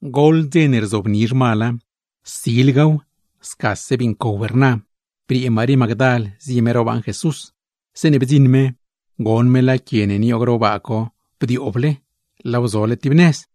Goḻ dze ne rzobni zhmala, silgaw, scase bii ncow rnaw, briee Marí Magdal zie me ro baaṉ Jesús. Zeeṉe bdziṉ me, goṉ me laa quie ne nioog ro baa co bdiooble, laaw zole tib nëz.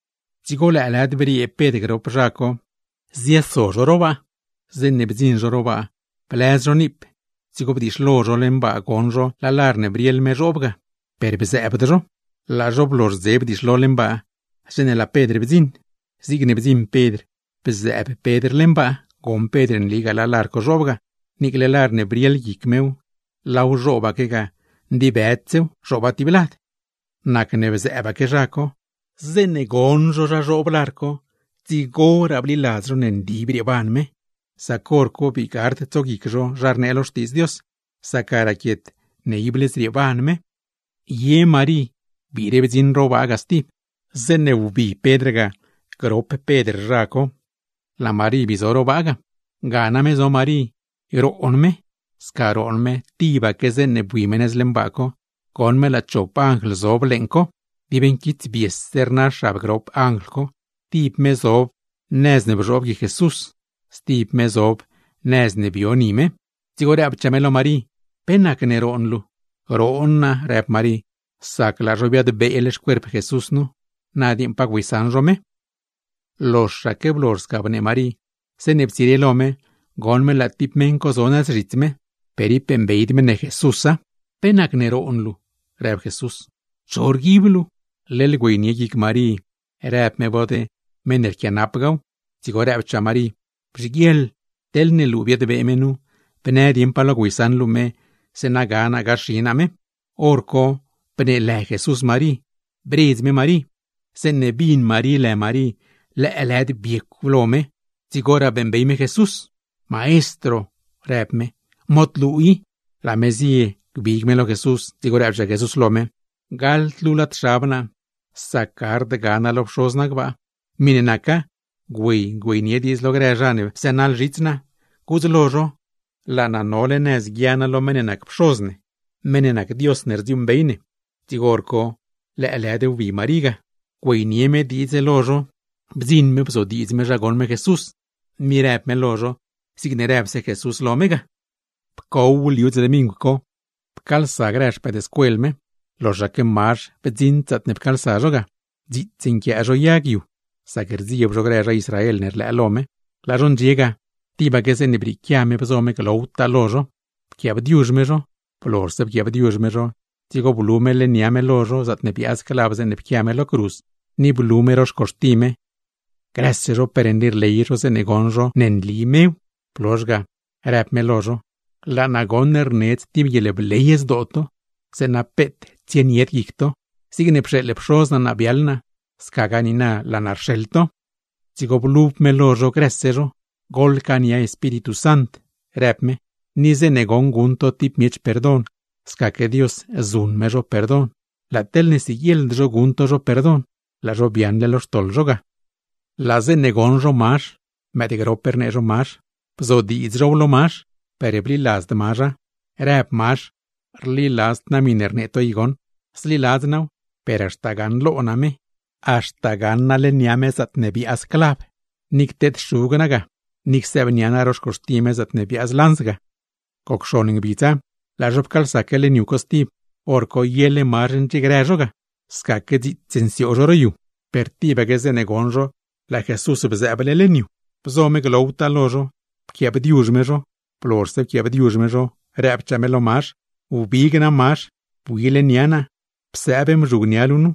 Dzigo lëëlëd, briee no grop no Pedr, zioso no ro baa. Zeeṉe bdziṉ naa ro baa, blëz naa niip, dzigo bdiixlo naa leṉ baa goṉ naa laa lar ne brieḻ me zhoob ga; per bzëëbd naa. Laa naa blozhdze bdiixlo leṉ baa, zeeṉe laa Pedr blanso. Zigne blanso Pedr bzëëb Pedr leṉ baa, goṉ Pedr nligaa laa lar co zhoob ga, niicle lar ne brieḻ guic mew, laaw zhoobaque ga; ndibëdsew, zhooba tib lad. Nacne bzëëbaque naa. Zeeṉe goṉ naa zha zhoob lar co, dzigoraa bliladz naa ne nli brieeban me. ¡Sac hor co, bii gard tsoguic naa zha rnee lo Xtiidz Dios; sac ga raquiet ne ible zrieeban me! Ye Marí biire blanso ro baa ga stib. Zeeṉe wbii no ga grop no Pedr, laa Marí bii zo ro baa ga. Ga name zo Marí roon me. Sca roon me, tibaque zeeṉe bui me nëz leṉ baa co, goṉ me laa chop anjl zob leeṉ co. Dib nquitsbiese rna xab grop anjl co, tib me zob nëz ne bzhoob guic Jesús, stib me zob nëz ne bio ni me; dzigo rëbchaa me lo Marí: ―¿Pe nacne roon luu? ―Roon naa ―rëb Marí―, sac laa zho biadbee xcuerp Jesús nu, na dieeṉ pa güeysaṉ zho me. Loxaque blozh sca bnee me, zeeṉe ptsire lo me goṉ me laa tib meṉ co zo gax zhits me. ¡Per ib beeṉbeyd me ne Jesúsa! ―¿Pe nacne roon luu? ―rëb Jesús―. ¿Cho rguib luu? Leḻ güeynie guic Marí rëb me bod meṉ ne rquianap gaw, dzigo rëbchaa me: ―Bzhiguieḻ, teḻne luu biadbee me nu, bnë dieṉ pa lo güeysaṉ luu me; zeeṉa ga naa gaxi naa me. Horco bneelë Jesús Marí, bredz me me. Zeeṉe bin Marí lë me, lëëlëd biecw me; dzigoraa beeṉbey me Jesús. ―¡Maestro! ―rëb me―. ¡Mod luu i! Laa me zie gbig me lo Jesús. Dzigo rëbchaa Jesús: ―¡Xeeṉd luu naa! Sac gard guia naa lo Pxoz naa gbaa. Miṉe naca, güey güeynie diidz lo grë zha ne bzënaḻ zhits naa; gudz lo zho: Laa naa nole nëz guia naa lo meṉ ne nac Pxoz ne, meṉ ne nac Dios ne rdziuuṉbey ne. Horco lëëlëd wbi Marí ga, ziaadnie me diidz lo no. Blanso me bzodiidz me zha goṉ me Jesús, ni në me lo no zigne rëbse Jesús lo me ga. Pcow liu dze dmingw co, grëse no ne nac no xpëëdscuel me laa no pcaalsa; loxaque Mazh ruṉfalt. Dziits nquiaa no yag yu, sac rdzieeb no grë zha Israel ne rlëënie me. Laa no ndxie ga, tibaque zeeṉe brieequia me bzo me glowtaa lo no; pquiaabdiuzh me no. Blozhse pquiaabdiuzh me no, dzigo blu me leṉ nia me lo no, zaatne biaaz clav zeeṉe pquia me lo cruz, ni blu me ro xcuxti me. ¡Grëse no per nli rley no zeeṉe bdzioṉ no ne nli mew! Blozh ga, në me lo no: ―¡Laa naa rnedz tib guieḻbley zdoo to, zeeṉa peet tsienied guic to! Zigne pxeeḻ Pxoz naa naa biaḻ naa, scagaa niina laa naa rxeḻ to. Dzigo blub me lo no grëse no. ―Goḻcaania Espíritu Sant ―në me―. Ni zeeṉe goṉ guṉ to tib miech perdon, scaque Dios zuṉ me zho perdon; laa teḻne siguieḻd zho guṉ to zho perdon, laa zho biaaṉle lo xtoḻ zho ga. Zeeṉe bdzioṉ no Mazh (Mazh ne rnee zho “Mëëdgrop” ga), bzodiidz now lo Mazh, per bliladzd Mazha, rnee Mazh: ―Rliladzd naa miṉe rnee to i goṉ. Zliladz naaw, per haxta gaṉlo naa me, haxta gaṉ naa leṉ nia me zaatne biaaz clav, ni cteed-xug naa ga; ni csëëbnia naa ro xcuxti me zaatne biaaz lanz ga. Goc xon ngbidza, laa no pcaalsaque leṉ yu co stib; hor cosi yele Mazh ndxiegrë no ga. Scaque dziits nsioog no ro yu, per tibaque zeeṉe bdzioṉ no laa Jesús bzëëb leṉ yu ga stib, bzo me glowtaa lo no, pquiaabdiuzh me no. Blozhse pquiaabdiuzh me no, rëbchaa me lo Mazh: ―Wbig na Mazh, bui leṉ nia naa, psëëb mzhugnia luu nu.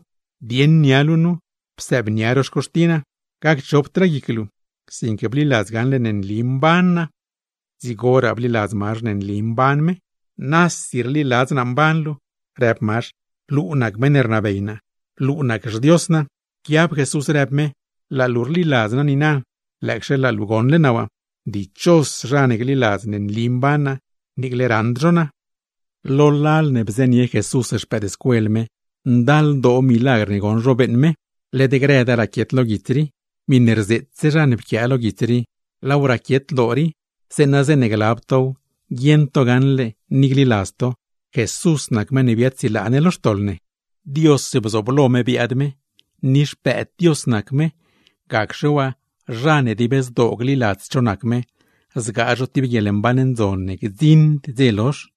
Dieṉ nia luu nu, psëëbnia ro xcuxti naa. Gacchopdraa guic luu, sinque bliladz gaṉle ne nli mban naa. Dzigoraa bliladz Mazh ne nli mban me. ―Nasi rliladz naa mban luu ―rëb Mazh―. Luu nac meṉ ne rnabey naa, luu nac xDios naa. Pquiab Jesús rëb me: ―Laa luu rliladz niina, lëëcxe laa luu goṉle naa waa. ¡Dichos zha ne gliladz ne nli mban naa, niicle raṉd zho naa! Lo lal ne bzënie Jesús no, ndaldoo milagr ne bdzioṉ no beeṉ me, led grëda raquiet lo guits rii. Miṉe pquiase naa nu, laaw pquia naa zeeṉa zeeṉe glab tow, guieṉ to gaṉle ni gliladz to: Jesús nac meṉ ne biaadsilaa ne lo xtoḻ ne, Dios bzooblo me biaad me, ni Xpëëd Dios nac me; sac zha ne dib zdoo gliladz cho nac me, zgaa zho tib guieḻmban ndzon ne gdziṉd dze lozh.